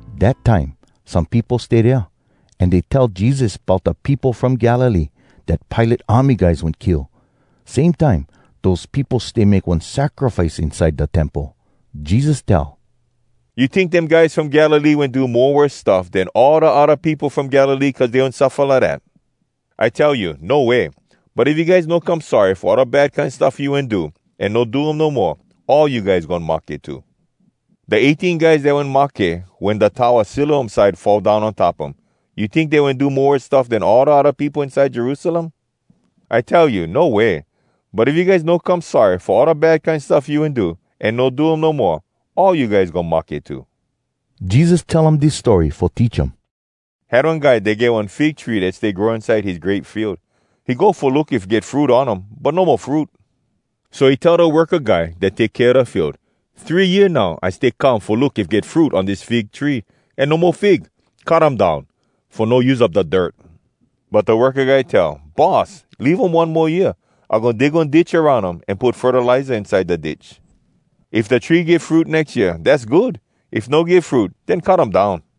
Dat time some peopo stay dea, an dey tell Jesus bout da peopo from Galilee dat Pilate army guys wen kill, same time dose peopo stay make one sacrifice inside da Temple. Jesus tell, “You tink dem guys from Galilee wen do mo worse stuff den all da odda peopo from Galilee cuz dey wen suffa lidat? I tell you, no way! But if you guys no come sorry fo all da bad kine stuff you wen do, an no do um no moa, all you guys goin mahke too. Da eighteen guys dat wen mahke wen da towa Siloam side fall down on top um—you tink dey wen do mo worse stuff den all da odda peopo inside Jerusalem? I tell you, no way! But if you guys no come sorry fo all da bad kine stuff you wen do, an no do um no moa, all you guys goin mahke too.” Jesus tell um dis story fo teach um. “Had one guy dat get one fig tree dat stay grow inside his grape field. He go fo look if get fruit on um, but no mo fruit. So he tell da worka guy dat take kea da field, ‘Three year now I stay come fo look if get fruit on dis fig tree, an no mo fig! Cut um down, fo no use up da dirt!’ But da worka guy tell, ‘Boss, leave um one mo year. I goin dig one ditch aroun um, an put fertiliza inside da ditch. If da tree give fruit nex year, dass good! If no give fruit, den cut um down!’”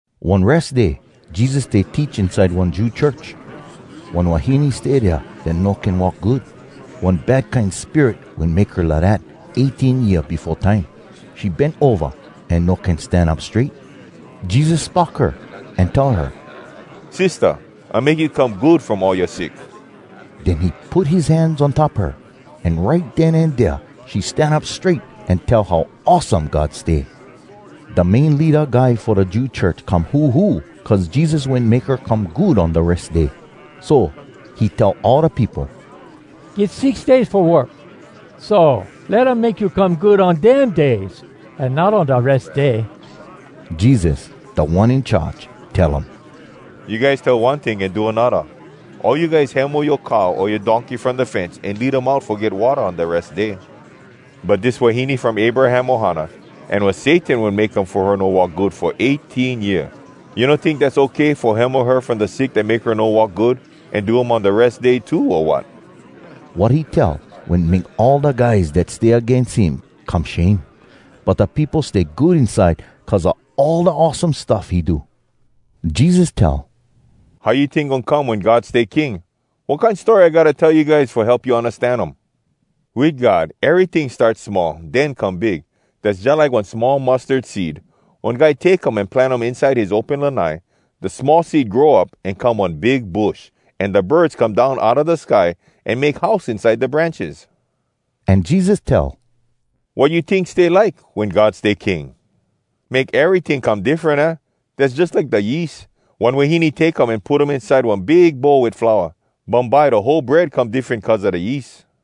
One Res Day Jesus stay teach inside one Jew church. One wahine stay dea dat no can walk good. One bad kine spirit wen make her lidat eighteen year befo time. She bent ova an no can stan up strait. Jesus spock her, an tell her, “Sistah, I make you come good from all yoa sick!” Den he put his hands on top her, an right den an dea she stan up strait an tell how awesome God stay. Da main leada guy fo da Jew church come huhu cuz Jesus wen make her come good on da Res Day. So, he tell all da peopo, “Get six days fo work. So, let um make you come good on dem days, an not on da Res Day!” Jesus, Da One In Charge, tell um, “You guys tell one ting an do anodda! All you guys hemo yoa cow o yoa donkey from da fence an lead um out fo get watta on da Res Day. But dis wahine from Abraham ohana, an was Satan wen make um fo her no walk good fo eighteen year. You no tink dass okay fo hemo her from da sick dat make her no walk good, an do um on da Res Day too, o wat?” Wat he tell wen make all da guys dat stay agains him come shame. But da peopo stay good inside cuz a all da awesome stuff he do. Jesus tell, “How you tink goin come wen God stay king? Wat kine story I gotta tell you guys fo help you undastan um? Wit God, eryting start small, den come big. Dass jalike one small mustard seed. One guy take um an plant um inside his open lanai. Da small seed grow up, an come one big bush, an da birds come down outa da sky an make house inside da branches.” An Jesus tell, “Wat you tink stay like, wen God stay king? Make eryting come diffren, aah? Dass jalike da yeast. One wahine take um an put um inside one big bowl wit flour. Bumbye da whole bread come diffren cuz a da yeast.”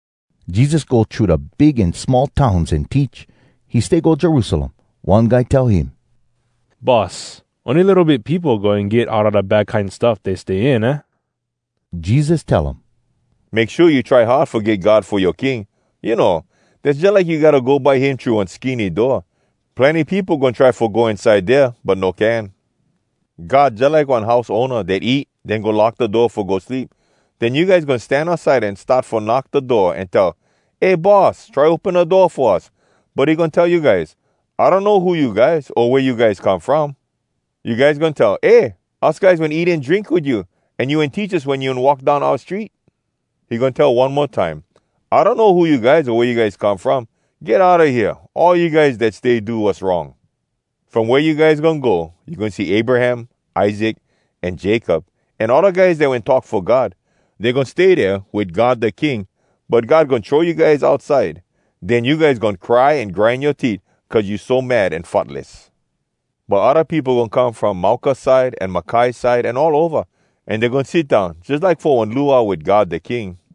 Jesus go thru da big an small towns an teach. He stay go Jerusalem. One guy tell him, “Boss, ony litto bit peopo goin get outa da bad kine stuff dey stay in, aah?” Jesus tell um, “Make shua you try hard fo get God fo yoa king! You know, dass jalike you gotta go by him thru one skinny door. Plenny peopo goin try fo go inside dea, but no can. God jalike one house owna dat eat, den go lock da door fo go sleep. Den you guys goin stan outside an start fo knock da door an tell, ‘Eh Boss, try open da door fo us!’ But he goin tell you guys, ‘I donno who you guys o wea you guys come from!’ You guys goin tell, ‘Eh! Us guys wen eat an drink wit you, an you wen teach us wen you walk down oua street.’ He goin tell one mo time, ‘I donno who you guys o wea you guys come from! Get outa hea, all you guys dat stay do wass wrong! From wea you guys goin go, you goin see Abraham, Isaac, an Jacob, an all da guys dat wen talk fo God. Dey goin stay dea wit God da King, but God goin throw you guys outside. Den you guys goin cry an grind yoa teet cuz you so mad an futless. But odda peopo goin come from mauka side an makai side an all ova, an dey goin sit down jalike fo one luau wit God da King.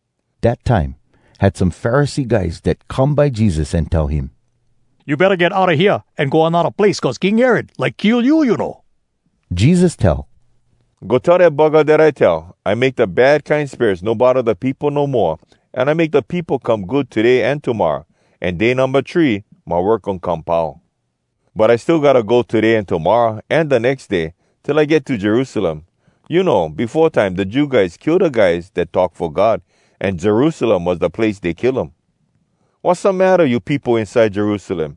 Dat time, had some Pharisee guys dat come by Jesus an tell him. “You betta get outa hea, an go anodda place, cuz King Herod like kill you, you know.” Jesus tell, “Go tell dat buggah dat I tell, ‘I make da bad kine spirits no bodda da peopo no moa, an I make da peopo come good today an tomorra. An day numba three, my work goin come pau.’ But I still gotta go today an tomorra an da nex day, till I get to Jerusalem. You know, befo time da Jew guys kill da guys dat talk fo God, an Jerusalem was da place dey kill um. “Wassamatta you peopo inside Jerusalem?!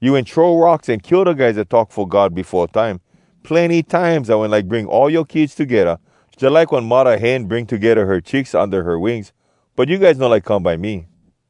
You wen throw rocks an kill da guys dat talk fo God befo time. Plenny times I wen like bring all yoa kids togedda, jalike one muddah hen bring togedda her chicks unda her wings, but you guys no like come by me!